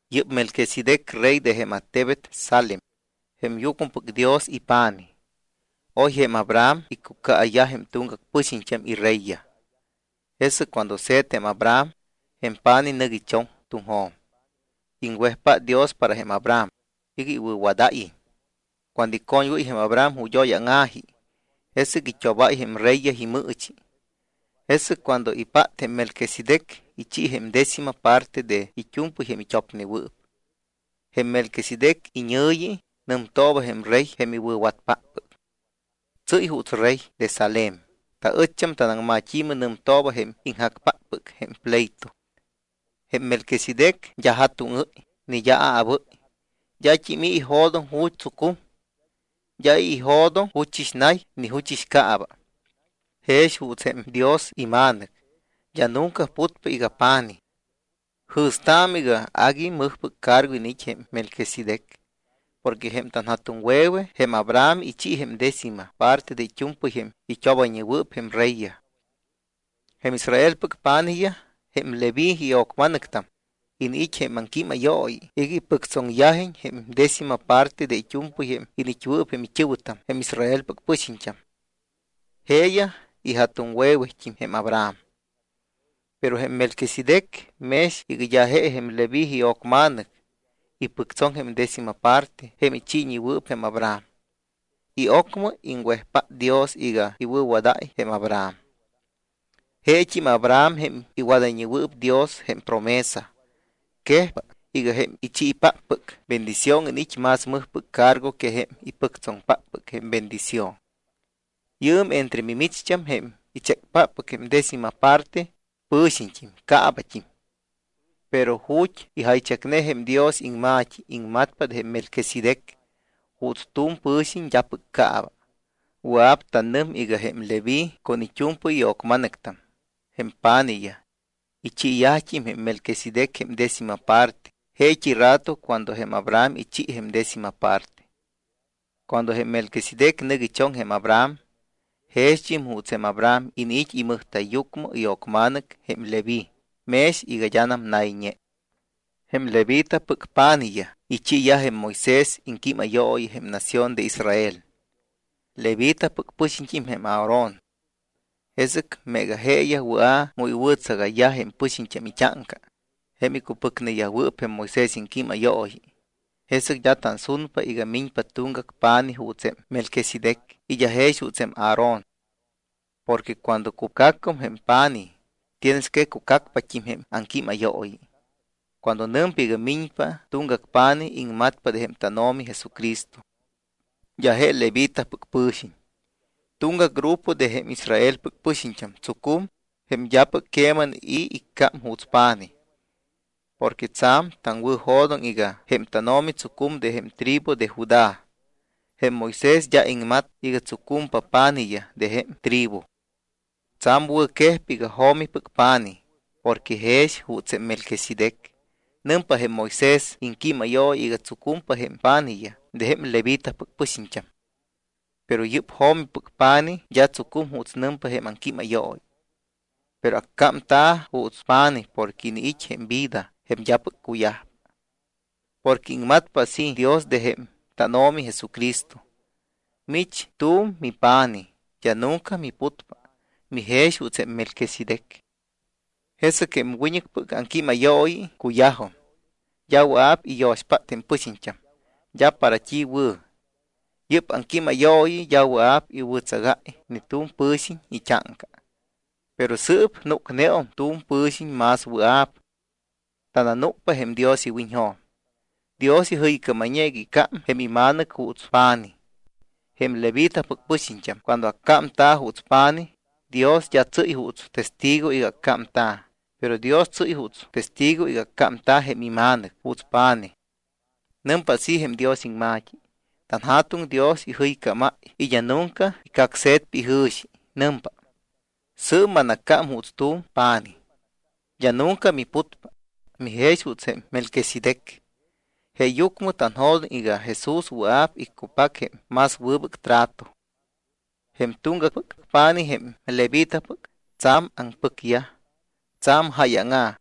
Yɨ́p Melquisedec rey de jém attebet Salem, jém yucmɨpɨc Dios ipa̱nij. Oy jém Abraham iccucaayyaj jém tuŋgac pɨxiñt́am ireyyaj. Jesɨc cuando se̱t jém Abraham, jém pa̱nij nɨc ichoŋ tuŋjo̱m. Iŋwejpát Dios para jém Abraham iga iwɨ̱wadáyiñ. Cuando icoñwɨ́y jém Abraham ju̱t́ oy áŋa̱ji, jesɨc it́obáy jém reyyaj imɨɨchi. Jesɨc cuando ipát jém Melquisedec, ichi jém décima parte de it́u̱mpɨy jém it́opnewɨɨp. Jém Melquisedec iñɨ̱yi nɨmtooba jém rey jém iwɨ̱watpáppɨc. Tsɨ́y juuts rey de Salem, taɨcht́am tanaŋmat́i̱mɨ nɨmtooba jém ijacpáppɨc jém pleito. Jém Melquisedec d́a ja̱tuŋɨ́y ni d́a aabɨ́y. D́at́im i̱ ijo̱doŋ ju̱t́ tsucum. D́a i̱ ijo̱doŋ juchɨx nay ni juchɨx caaba. Jex juuts jém Dios iMa̱nɨc, d́a nunca putpa iga pa̱nij. Jɨ̱staamɨ iga agui mɨjpɨc cargo iniit́ jém Melquisedec. Porque jém tanja̱tuŋwe̱we jém Abraham ichi jém décima parte de it́u̱mpɨy jém it́obayñewɨɨp jém reyyaj. Jém Israelpɨc pa̱nijyaj, jém Leví io̱cma̱nɨctam, iniit́ jém aŋquímayooyi iga ipɨctsoŋyajiñ jém décima parte de it́u̱mpɨy jém iniit́wɨɨp jém it́ɨ̱wɨtam, jém Israelpɨc pɨxiñt́am. Jeeyaj ija̱tuŋwe̱wet́im jém Abraham. Pero jém Melquisedec, mex iga d́a je jém Leví io̱cma̱nɨc, ipɨctsoŋ jém décima parte jém ichiiwɨɨp jém Abraham. Y ocmɨ iŋwejpát Dios iga iwɨ̱wadáy jém Abraham. Jeet́im Abraham jém iwadayñewɨɨp Dios jém promesa. Quejpa iga jém ichiipáppɨc bendición iniit́ más mɨjpɨc cargo que jém ipɨctsoŋpáppɨc jém bendición. Yɨɨm entre mimicht́am, jém ichécpáppɨc jém décima parte, pɨ̱xiñt́im, caabat́im. Pero ju̱t́ ijaychacne jém Dios iŋma̱t́i, iŋmatpa de jém Melquisedec juuts tu̱m pɨ̱xiñ d́apɨc caaba. Wɨa̱p tanɨm iga jém Leví con it́u̱mpɨy io̱cma̱nɨctam, jém pa̱nijyaj, ichiiyajt́im jém Melquisedec jém décima parte jeet́i rato cuando jém Abraham ichi jém décima parte. Cuando jém Melquisedec nɨc ichoŋ jém Abraham, jext́im juuts jém Abraham iniit́ imɨjta̱yyucmɨ io̱cma̱nɨc jém Leví mex iga d́anam nayñe. Jém Levitapɨc pa̱nijyaj ichiiyaj jém Moisés iŋquímayooyi jém nación de Israel. Levitapɨc pɨ̱xiñt́im jém Aarón. Jesɨc meega jeeyaj wɨa̱ mu iwɨ̱tsagayyaj jém pɨxiñt́am it́áŋca, jém icupɨcneyajwɨɨp jém Moisés iŋquímayooyi, jesɨc d́a tansunpa iga miñpa tuŋgac pa̱nij juuts jém Melquisedec y d́a jex juuts jém Aarón. Porque cuando cucacum jém pa̱nij, tienes que cucacpat́im jém aŋquímayooyi. Cuando nɨmpa iga miñpa tuŋgac pa̱nij, iŋmatpa de jém tánO̱mi Jesucristo. D́a je levitapɨc pɨ̱xiñ. Tuŋgac grupo de jém Israelpɨc pɨxiñt́am tsucum, jém d́apɨc queman i̱ iccám juuts pa̱nij. Porque tsa̱m taŋwɨ̱jo̱doŋ iga jém tánO̱mi tsucum de jém tribu de Judá. Jém Moisés d́a iŋmat iga tsucumpa pa̱nijyaj de jém tribu. Tsa̱m wɨ̱quejpa iga jo̱mipɨc pa̱nij porque jex juuts jém Melquisedec. Nɨmpa jém Moisés iŋquímayooyi iga tsucumpa jém pa̱nijyaj de jém levitapɨc pɨxiñt́am. Pero yɨ́p jo̱mipɨc pa̱nij d́a tsucum juuts nɨmpa jém aŋquímayooyi, pero accámta̱ juuts pa̱nij porque iniit́ jém vida jém d́apɨc cuyajpa. Porque iŋmatpa así Dios de jém tánO̱mi Jesucristo: Mich tu̱m mipa̱nij, d́a nunca miputpa. Mijex juuts jém Melquisedec. Jesɨc jém wiñɨcpɨc aŋquímayooyi cuyajum. D́a wɨa̱p iyo̱xpát jém pɨxiñt́am. D́a para t́i wɨ̱. Yɨ́p aŋquímayooyi d́a wɨa̱p iwɨ̱tsagáy ni tu̱m pɨ̱xiñ it́áŋca. Pero sɨɨp núcneum tu̱m pɨ̱xiñ más wɨa̱p. Tananúcpa jém Dios iwiñjo̱m. Dios ijɨycámayñe iga iccám jém iMa̱nɨc juuts pa̱nij. Jém levitapɨc pɨxiñt́am cuando accámta̱ juuts pa̱nij, Dios d́a tsɨ́y juuts testigo iga accámta̱. Pero Dios tsɨ́y juuts testigo iga accámta̱ jém iMa̱nɨc juuts pa̱nij. Nɨmpa así jém Dios iŋma̱t́i: TanJa̱tuŋ Dios ijɨycámáy y d́a nunca icacse̱tpa ijɨ̱xi. Nɨmpa: “Sɨɨp manaccám juuts tu̱m pa̱nij. D́a nunca miputpa. Mijex juuts jém Melquisedec.” Jeeyucmɨ tanjo̱doŋ iga Jesús wɨa̱p iccupac jém más wɨbɨc trato. Jém tuŋgacpɨc pa̱nij, jém levitapɨc, tsa̱m aŋpɨcyaj, tsa̱m jáyaŋa̱.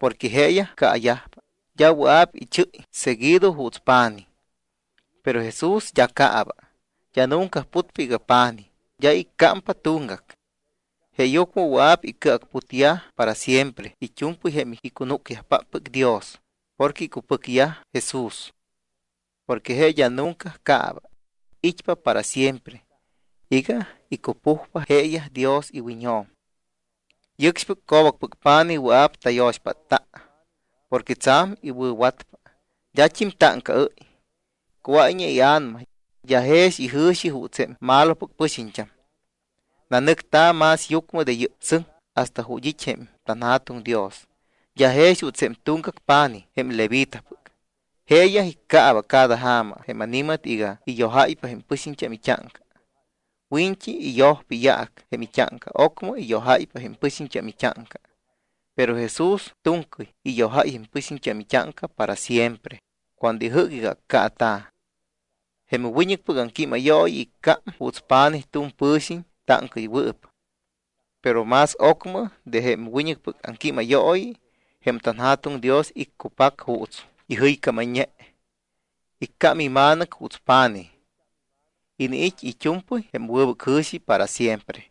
Porque jeeyaj caayajpa, d́a wɨa̱p ichɨ́y seguido juuts pa̱nij. Pero Jesús d́a caaba. D́a nunca putpa iga pa̱nij, d́a iccámpa tuŋgac. Jeeyucmɨ wɨa̱p icɨacputyaj para siempre it́u̱mpɨy jém icunúcyajpáppɨc Dios porque icupɨcneyaj Jesús. Porque je d́a nunca caaba. It́pa para siempre iga icupujpa jeeyaj Dios iwiñjo̱m. Yɨcxpɨc co̱bacpɨc pa̱nij wɨa̱p tayo̱xpátta porque tsa̱m iwɨ̱watpa, d́at́im táŋcaɨ́y, cuáyñe ia̱nama, d́a jex ijɨ̱xi juuts jém malopɨc pɨxiñt́am. Nanɨcta̱ más yucmɨ de yɨ́p sɨŋ hasta ju̱t́ it́ jém tanJa̱tuŋ Dios. D́a jex juuts jém tuŋgac pa̱nij jém levitapɨc. Jeeyaj iccaaba cada ja̱ma jém ani̱mat iga iyojáypa jém pɨxiñt́am it́áŋca. Wiñt́i iyojpa iyaac jém it́áŋca, ocmɨ iyojáypa jém pɨxiñt́am it́áŋca. Pero Jesús tu̱ŋcɨy iyojáy jém pɨxiñt́am it́áŋca para siempre cuando ijɨ́c iga accaata̱. Jém wiñɨcpɨc aŋquímayooyi iccám juuts pa̱nij tu̱m pɨ̱xiñ táŋcaɨywɨɨp. Pero más ocmɨ de jém wiñɨcpɨc aŋquímayooyi, jém tanJa̱tuŋ Dios iccupac juuts ijɨycámne, iccám iMa̱nɨc juuts pa̱nij. Iniit́ it́u̱mpɨy jém wɨbɨc jɨ̱xi para siempre.